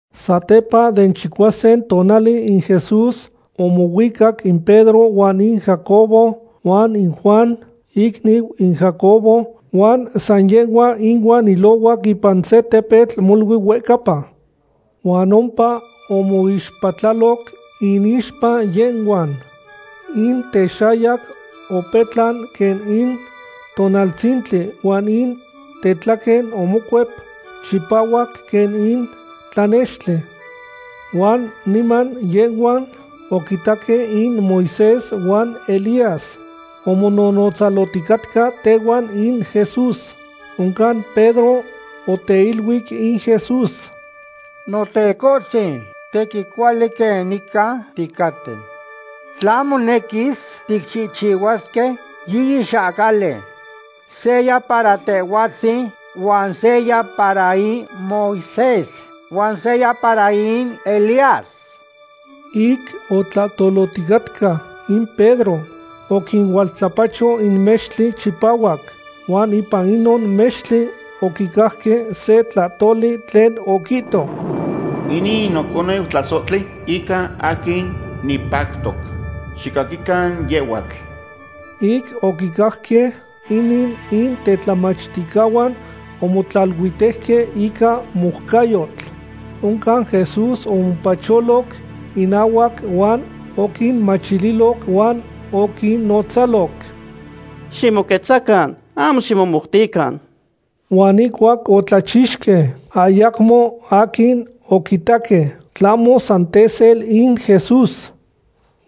Satepa den chicuasin tonali in Jesús omohuicac in Pedro huan in Jacobo huan in Juan, icniu in Jacobo, huan san yehhuan inuan oilohuac ipan se tepetl molui huehcapa. Huan ompa omoixpatlaloc inixpa yehhuan. In texayac opetlan quen in tonaltzintli huan in tetlaquen omocuep chipahuac quen in tlanextli. Huan niman yehhuan oquitaque in Moisés huan Elías omonohnotzalohticatca tehuan in Jesús. Oncan Pedro oteiluic in Jesús: ―Notecohtzin, tequin cuali quen nican ticaten. Tla monequis, ticchihchihuasque yiyi xahcali; seya para Tehhuatzin, huan seya para in Moisés, huan seya para in Elías. Ic otlahtohticatca in Pedro, oquinualtlapacho in mextli chipahuac huan ipan inon mextli oquicajque se tlahtoli tlen oquihto: ―Inin in noconeu tlasohtli ica aquin nipactoc. Xicaquican yehhuatl. Ic oquicajque inin, in tetlamachticahuan omotlaluitejque ica moucayotl. Oncan Jesús omopacholoc innahuac huan oquinmachililoc huan oquinnotzaloc: ―Ximoquetzacan; ahmo ximomoutican. Huan ihcuac otlachixque, ayacmo aquin oquitaque, tlahmo san tesel in Jesús.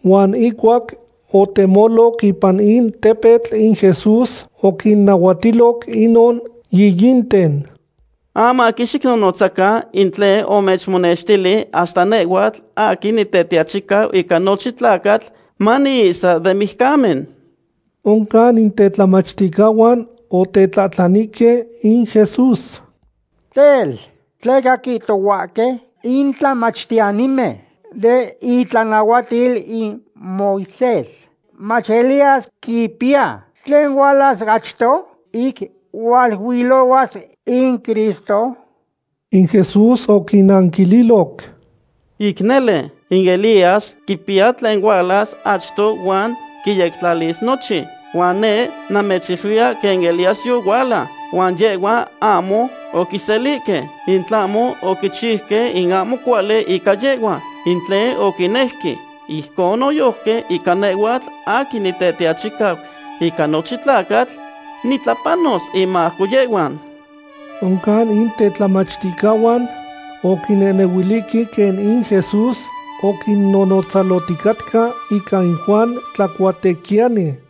Huan ihcuac otemoloc ipan in tepetl in Jesús oquinnahuatiloc inon yiyinten: ―Ahmo aquin xicnonotzacan in tlen omechmonextili hasta nehhuatl aquin Nitetiachicau ica nochin tlacatl maniihsa den mijcamen. Oncan in tetlamachticahuan otetlahtlanihque in Jesús: ―Tel, ¿tleca quihtohuahque in tlamachtiyanimen den itlanahuatil in Moisés mach Elías quipiya tlen hualas achto ic hualuilohuas in Cristo? In Jesús oquinnanquililoc: ―Ic nele, in Elías quipiya tlen hualas achto huan quiyectlalis nochin. Huan neh namechiluiya quen Elías yohuala, huan yehhuan ahmo oquiselihque, in tlahmo oquichiuque in ahmo cuali ica yehhua, in tlen oquinejque. Ijcon noyojqui ica nehhuatl aquin Nitetiachicau ica nochin tlacatl, nitlapanos inmajco yehhuan. Oncan in tetlamachticahuan oquinehnehuilihque quen in Jesús oquinnonotzalohticatca ica in Juan Tlacuatequiyani.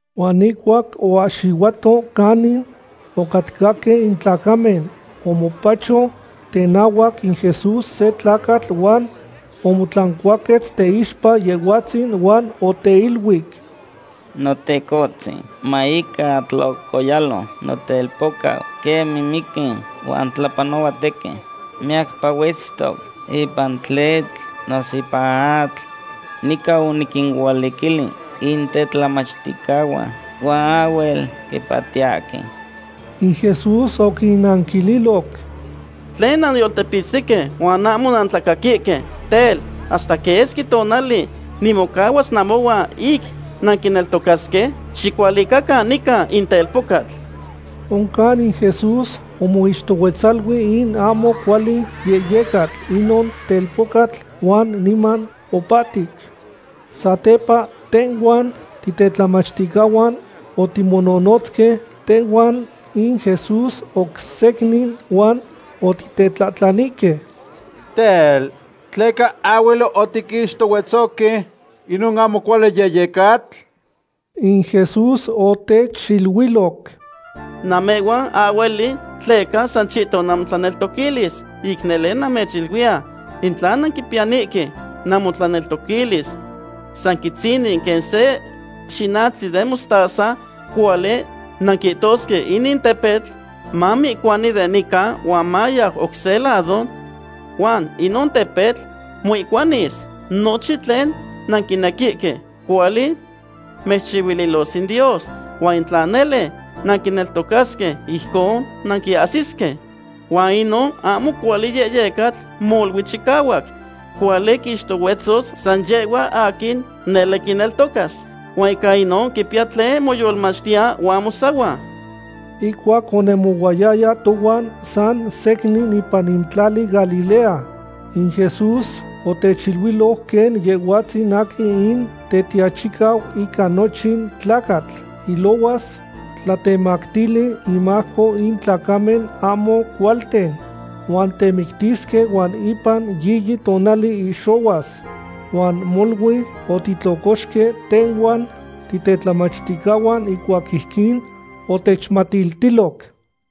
Huan ihcuac oahxihuato canin ocatcahque in tlacamen, omopacho tenahuac in Jesús se tlacatl huan omotlancuaquetz teixpa Yehhuatzin huan oteiluic: ―Notecohtzin, ma ica tlocoyalo notelpocau, quen mimiqui huan tlapanohua tequin. Miyacpa huetztoc ipan tletl noso ipan atl. Nican oniquinualiquili in tetlamachticahuan huan ahhuel quipahtiyahque. In Jesús oquinanquililoc: ―¡Tlen nanyoltepitztihque huan ahmo nantlacaquihque! Tel, ¿hasta quesqui tonali nimocahuas namohuan ic nanquineltocasque? Xicualicacan nican in telpocatl. Oncan in Jesús omoixtohuetzalui in ahmo cuali yehyecatl inon telpocatl huan niman opahtic. Satepa tehhuan titetlamachticahuan otimonohnotzque tehuan in Jesús oc secnin huan otitetlahtlanihque: ―Tel, ¿tleca ahhuel otiquixtohuetzohque inon ahmo cuali yehyecatl? In Jesús otechiluiloc: ―Namehhuan ahhueli tleca san chihton namotlaneltoquilis. Ic nele namechiluiya, in tla nanquipiyanihque namotlaneltoquilis san quitzinin quen se xinachtli den mostaza, cuali nanquihtosque inin tepetl: “Mamoihcuani de nican huan mayau oc se lado”; huan inon tepetl moihcuanis. Nochin tlen nanquinequihque, cuali mechchihuililos in Dios. Huan tla nele nanquineltocasque, ijcon nanquiahsisque. Huan inon ahmo cuali yehyecatl molui chicahuac. Cuali quixtohuetzos san yehhua aquin nele quineltocas. Huan ica inon quipiya tlen moyolmachtiya huan mosahua. Ihcuac onemohuayaya tohuan san secnin ipan in tlali Galilea, in Jesús otechiluiloc quen Yehhuatzin aquin in Tetiachicau ica nochin tlacatl ilohuas tlatemactili inmajco in tlacamen ahmo cualten. Huan temictisque huan ipan yiyi tonali ihxohuas. Huan molui otitlocoxque tehhuan titetlamachticahuan ihcuac ijquin otechmatiltiloc.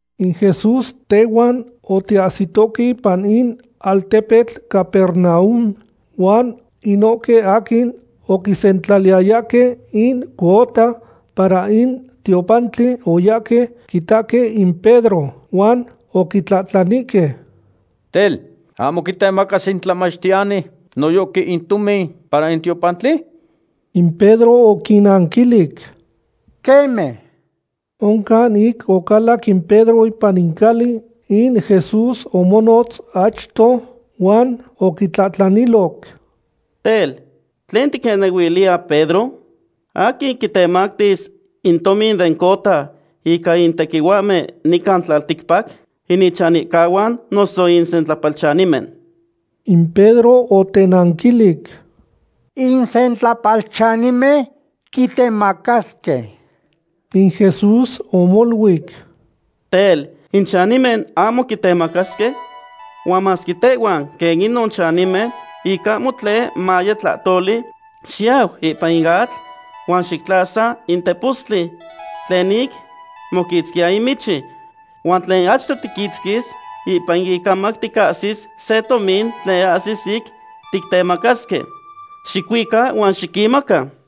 In Jesús tehuan otiahsitoque ipan in altepetl Capernaum. Huan inohque aquin oquisentlaliyayahque in cuota para in tiopantli oyahque quitahque in Pedro huan oquitlahtlanihque: ―Tel, ¿ahmo quitemacas in tlamachtiyani noyojqui in tomin para in tiopantli? In Pedro oquinnanquilic: ―Queme. Oncan ic ocalac in Pedro ipan in cali, in Jesús omonotz achto huan oquitlahtlaniloc: ―Tel, ¿tlen ticnehnehuiliya, Pedro? ¿Aquin quitemacasque in tomin den cuota ica in tequihuahmen nican tlalticpac? ¿In ichanihcahuan noso in sentlapalchanimen? In Pedro otenanquilic: ―In sentlapalchanimen quitemacasque. In Jesús omoluic: ―Tel, in chanimen ahmo quitemacasque. Huan masque tehhuan quen inon chanimen, ic ahmo tlen maye tlahtoli, xiyau ipan in atl, huan xictlasa in tepostli tlen ic moquitzquiya in michi. Huan tlen achto tiquitzquis, ipan in icamac ticahsis se tomin tlen ahsis ic tictemacasque. Xicuica huan xiquinmaca.